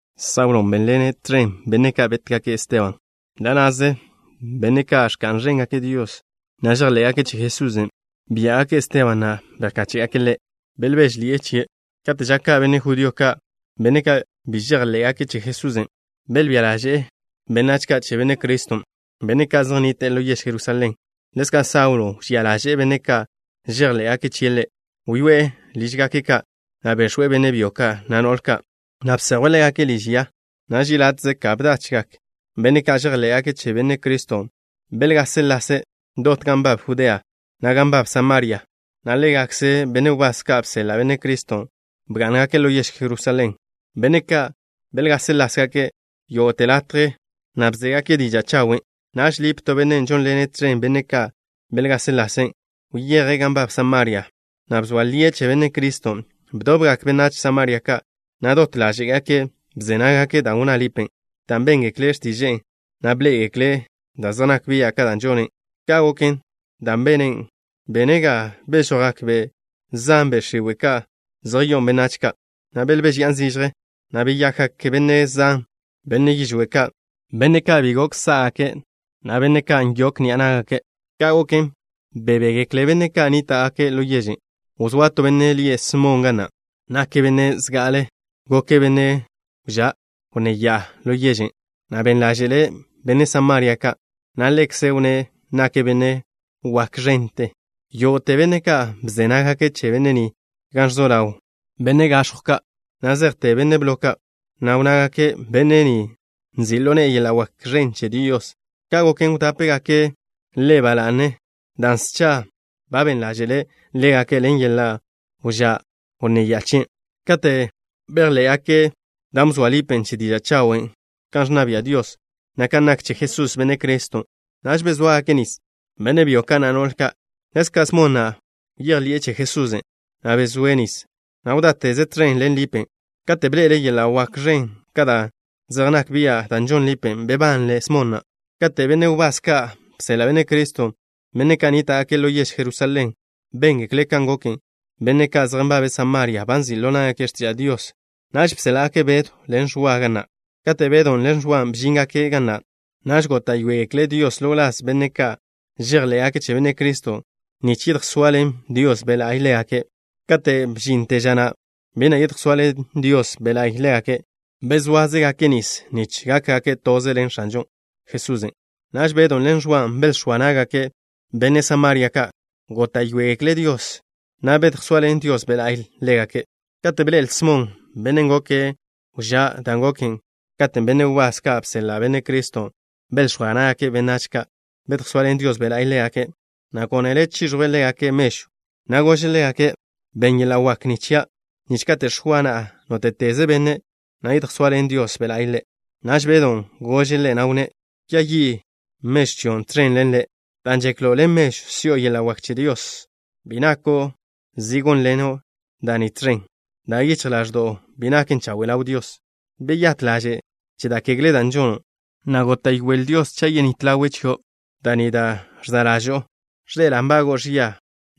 Saulo bénḻene' tẕen benne' ka' bétgake' Esteban. Ḻa' na'ze benne' ka' ẕka'n ẕéngake' Dios, na' žejḻé'gake' che Jesusen', biá'gake' Esteban, na' bejkáche'gake' ḻe'. Belbéžeḻi'e chie'. Kate' ža ka' benne' judío ka', benne' ka' bi žejḻé'gake' che Jesusen', belbía ḻáže'ḻi'e benách ka' che Benne' Criston', benne' ka' zej nnite'e ḻo yež Jerusalén. Ḻezka' Saulo wžía ḻaže'e benne' ka' žejḻé'gake' chie' Ḻe'. Wyoé'e lížgake' ka', na' bex̱we' benne' byo ka', na' no'le ka', na' bsejwe' ḻégake' liž ya. Naž yeláte'ze ka bdachgak benne' ka' žejḻé'gake' che Benne' Criston', belgáseḻase' dot gan nbab Judea, na' gan nbab Samaria, na' ḻégakze benne' wbás ka' bseḻa' Benne' Criston' bgá'ngake' ḻo yež Jerusalén. Benne' ka' belgáseḻase' jake' yógo'te latje, na' bzégake' diža' chawen'. Naž Lip, to benne' žónḻene' tẕen benne' ka' belgáseḻase', wyeje' gan nbab Samaria, na' bzoa lie' che Benne' Criston'. Bdobgak benách Samaria ka', na' dot ḻáže'gake' bze nággake' da' wnná Lipen', dan' béngekle' x̱tiže'e, na' bḻé'egekle' da' zej nak bia' ka' da' žone'. Ka' goken, dan' bene' ga bežojgak be' zan, be' x̱iwe' ka' zej yo'o benách ka', na' belbéžeya'an zižje, na' beyakgak benne' zan, benne' yižwé' ka', benne' ka' bi gok sá'gake', na' benne' ka' gok nyokgak ni'a ná'gake'. Ka' goken, bebégekle benne' ka' nníta'gake' ḻo yežen'. Wzóa to benne' lie' Smon ga na'. Nake' benne' zga'ale goke' benne' wžá' wnné ya'a ḻo yežen', na' ben ḻáže'le' benne' Samaria ka', na' ḻekze' wnné' nake' benne' wak ẕente. Yógo'te benne' ka' bze nággake' che benne' ni, gan ẕzo ḻaw benne' gax̱jw ka', na' zejte benne' blo ka', na' wnnágake': “Benne' ni, nzi' ḻo ne'e yeḻa' wak ẕen che Dios.” Ka' goken, wdápegake' ḻe' ba la'ne, dan' scha ba ben ḻáže'le' ḻégake' ḻen yeḻa' wžá' wnné ya'a chie'. Kate' bejḻé'gake' da' bzoa li Lipen' che diža' chawen' kan ẕnna bia' Dios, na' kan nak che Jesús, Benne' Criston', naž bezóagake' nis, benne' byo ka', na' no'le ka'. Ḻezka' Smon na' bejḻi'e che Jesusen', na' bezóe' nis, na' wdáteze' tẕen ḻen Lipen'. Kate' bḻe'ele' yeḻa' wak ẕen ka' da' zej nak bian' da' žon Lipen', bebanle Smon na'. Kate' benne' wbás ka' bseḻa' Benne' Criston', benne' ka' nníta'gake' ḻo yež Jerusalén, béngekle' kan goken, benne' ka' zej nbabe' Samaria ba nzi' ḻo ná'gake' x̱tiža' Dios, naž bséḻa'gake' Bedw ḻen Ẕwa ga na'. Kate' Bedon' ḻen Ẕwan' bžíngake' ga na', naž góta'yoegekle' Dios ḻo wláz benne' ka' žejḻé'gake' che Benne' Criston', nich yedjsoaḻen Dios Be' La'y ḻégake'. Kate' bžinte ža na', bi na' yedjsoaḻen Dios Be' La'y ḻégake'. Bezóazegake' nis nich gákgake' toze ḻen X̱anžo Jesusen'. Naž Bedon' ḻen Ẕwan' belx̱óa ná'gake' benne' Samaria ka'. Góta'yoegekle' Dios, na' bedjsoaḻen Dios Be' La'y ḻégake'. Kate' bḻe'el Smon, bennen' goke' wžá', dan' goken katen' benne' wbás ka' bseḻa' Benne' Criston' belx̱óa ná'gake' benách ka', bedjsoaḻen Dios Be' La'y ḻégake', na' gónele' chiẕjwe' ḻégake' mežw, na' gože' ḻégake': —Benn yeḻa' wak ni chia', nich kate' x̱oa na'a nóte'teze benne', yedjsoaḻen Dios Be' La'y ḻe'. Naž Bedon' gože' ḻe', na' wnné': —Kwia yi' mežw chion' tẕen ḻen le', dan' žeklo' ḻen mežw si'o yeḻa' wak che Dios. Bi nako' zi gónḻeno' da' ni tẕen, dan' yichj ḻaẕdo'o bi naken chawe' ḻaw Dios. Beyát ḻaže' che da' kegle da' žono', na' góta'yoele Dios, cha' yenít ḻawe' chio' da' ni da' ẕza' ḻažo'o. Ẕḻe'ela' nbago'o ẕia,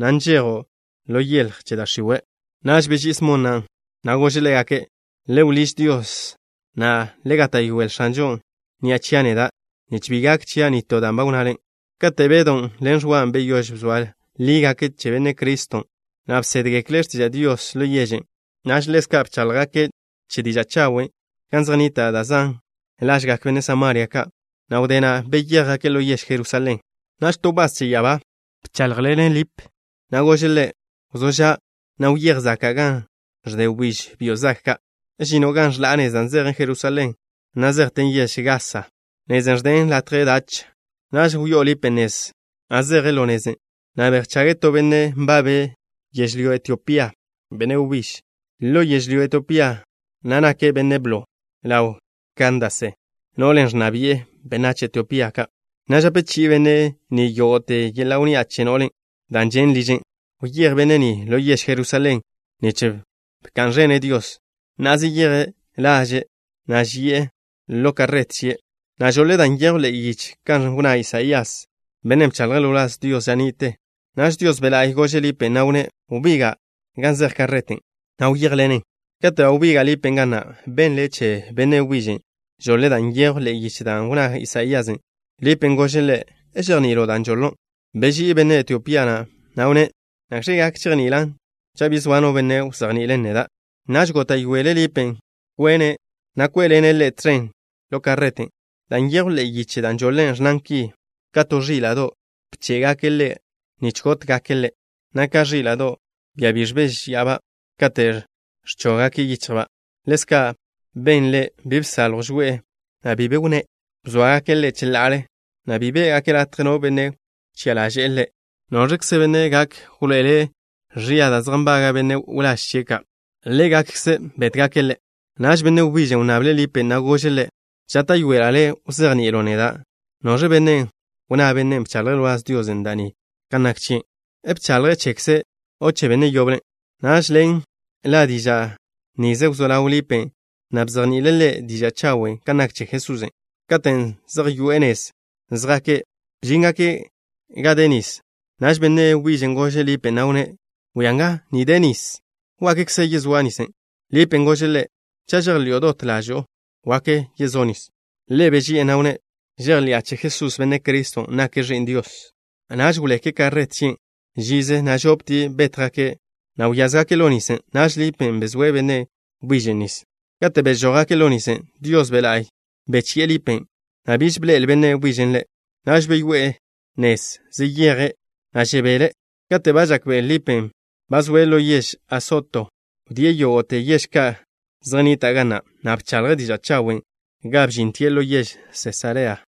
na' nžejo' ḻo yeḻj che da' x̱iwe'. Naž beží'i Smon na', na' gože' ḻégake': —Le wḻíž Dios, na' le gáta'yoele X̱anžon' ni'a chia' neda' nich bi gak chia' nitó da' ba wnnale. Kate' Bedon' ḻen Ẕwan' beyóž bzoa lígake' che Benne' Criston', na' bsédgekle' x̱tiža' Dios ḻo yežen', naž ḻezka' bcháḻjgake' che diža' chawen' gan zej nnita' da' zan lažgak benne' Samaria ka', na' wdé na' beyéjgake' ḻo yež Jerusalén. Naž to wbás che ya'abá bcháḻjḻene' Lip, na' gože' ḻe': —Wzó ža', na' wyéj zaka' gan ẕde wbíž byo' zag ka'. Žino' gan ẕḻa' nez da' zejen Jerusalén, na' zejten yež Gasa, nezen' ẕden latje dach. Naž wyó'o Lipen' nez, na' zeje' ḻo nezen', na' bejchage' to benne' nbabe' yežlyó Etiopía, benne' wbíž. Ḻo yežlyó Etiopía na' nake' benne' blo ḻaw Kandase, no'len' ẕnna bi'e benách Etiopía ka', na' žape chi'i benne' ni yógo'te yeḻa' wnni'a che no'len', dan' žen' liže'. Wyéj benne' ni ḻo yež Jerusalén nich bka'n ẕene' Dios. Na'a, zeyeje' laže', na' ži'e ḻo karret chie', na' žoḻe' da' nyejw ḻe'e yiche kan wnná Isaías, bennen' bchaḻje' ḻo wláz Dios ža ni'te. Naž Dios Be' La'y gože' Lipen', na' wnné': —Wbiga' gan zej karreten', na' wyéjḻenen. Kate' ba wbiga' Lipen' ga na', benle' che benne' wbižen'. Žoḻe' da' nyejw ḻe'e yiche dan' wnná Isaíasen'. Lipen' gože' ḻe': —¿Žejni'ilo' dan' žoḻo'? Beží'i benne' Etiopía na', na' wnné': —¿Nakx̱ gak chejni'ilan' cha' bi zoa no benne' wzejni'ile' neda'? Naž góta'yoele' Lipen' kwene', na' kwé'ḻene' ḻe' tẕen ḻo karreten'. Dan' nyejw ḻe'e yiche dan' žoḻe', ẕnnan ki: Ka to ẕíla'do', bché'gake' Ḻe' nich gótgake' Ḻe', na' ka ẕíla'do', bia bi ẕbéžeba' kate' ẕchóggake' yícha'ba', ḻezka' ben Ḻe', bi bsaljw žoe'e, na' bi be wnné'. Bzóagake' Ḻe' cheḻa'ale, na' bi biá'gake' latje no benne' wchi'a ḻaže'e Ḻe'. ¿Noẕkze benne' gak wḻoe'ele' ẕia da' zej nbaga' benne' wláž chie' ka'? Ḻégakkze' bétgake' Ḻe'. Naž benne' wbižen' wnnable' Lipen', na' gože' ḻe': —Žáta'yoela' le' wzejni'ilo' neda'. ¿Noẕ benne' wnná bennen' bchaḻje' ḻo wláz Dios da' ni kan nak chie'? ¿Bchaḻje' chekze', o che benne' yoble? Naž ḻen ḻa' diža' nize wzó ḻaw Lipen', na' bzejni'ile' ḻe' diža' chawen' kan nak che Jesusen'. Katen' zej yoe'e nez zjake', bžíngake' gan de nis. Naž benne' wbižen' gože' Lipen', na' wnné': —Bwia nga. Že' nis nga. ¿Wakkze yezóa' nis? Lipen' gože' ḻe': —Cha' žejḻi'o dot ḻažo'o, gak yezó' nis. Ḻe' beži'e, na' wnné': —Žejḻi'a che Jesús, Benne' Criston', nake' Ẕi'n Dios. Naž wleke' karret chien' žize, na' žoptie' bétjgake', na' wyázgake' ḻo nisen'. Naž Lipen' bezóe' benne' wbižen' nis. Kate' bežójgake' ḻo nisen', Dios Be' La'y bechi'e Lipen', na' biž bḻe'el benne' wbižen' ḻe'. Naž beyoé'e nezen', zeyeje', na' žebele'. Kate' ba žakbe'el Lipen', ba zoe' ḻo yež Asoto. Wdíe' yógo'te yež ka' zej nnitan' ga na', na' bchaḻje' diža' chawen' ga bžintie' ḻo yež Sesarea.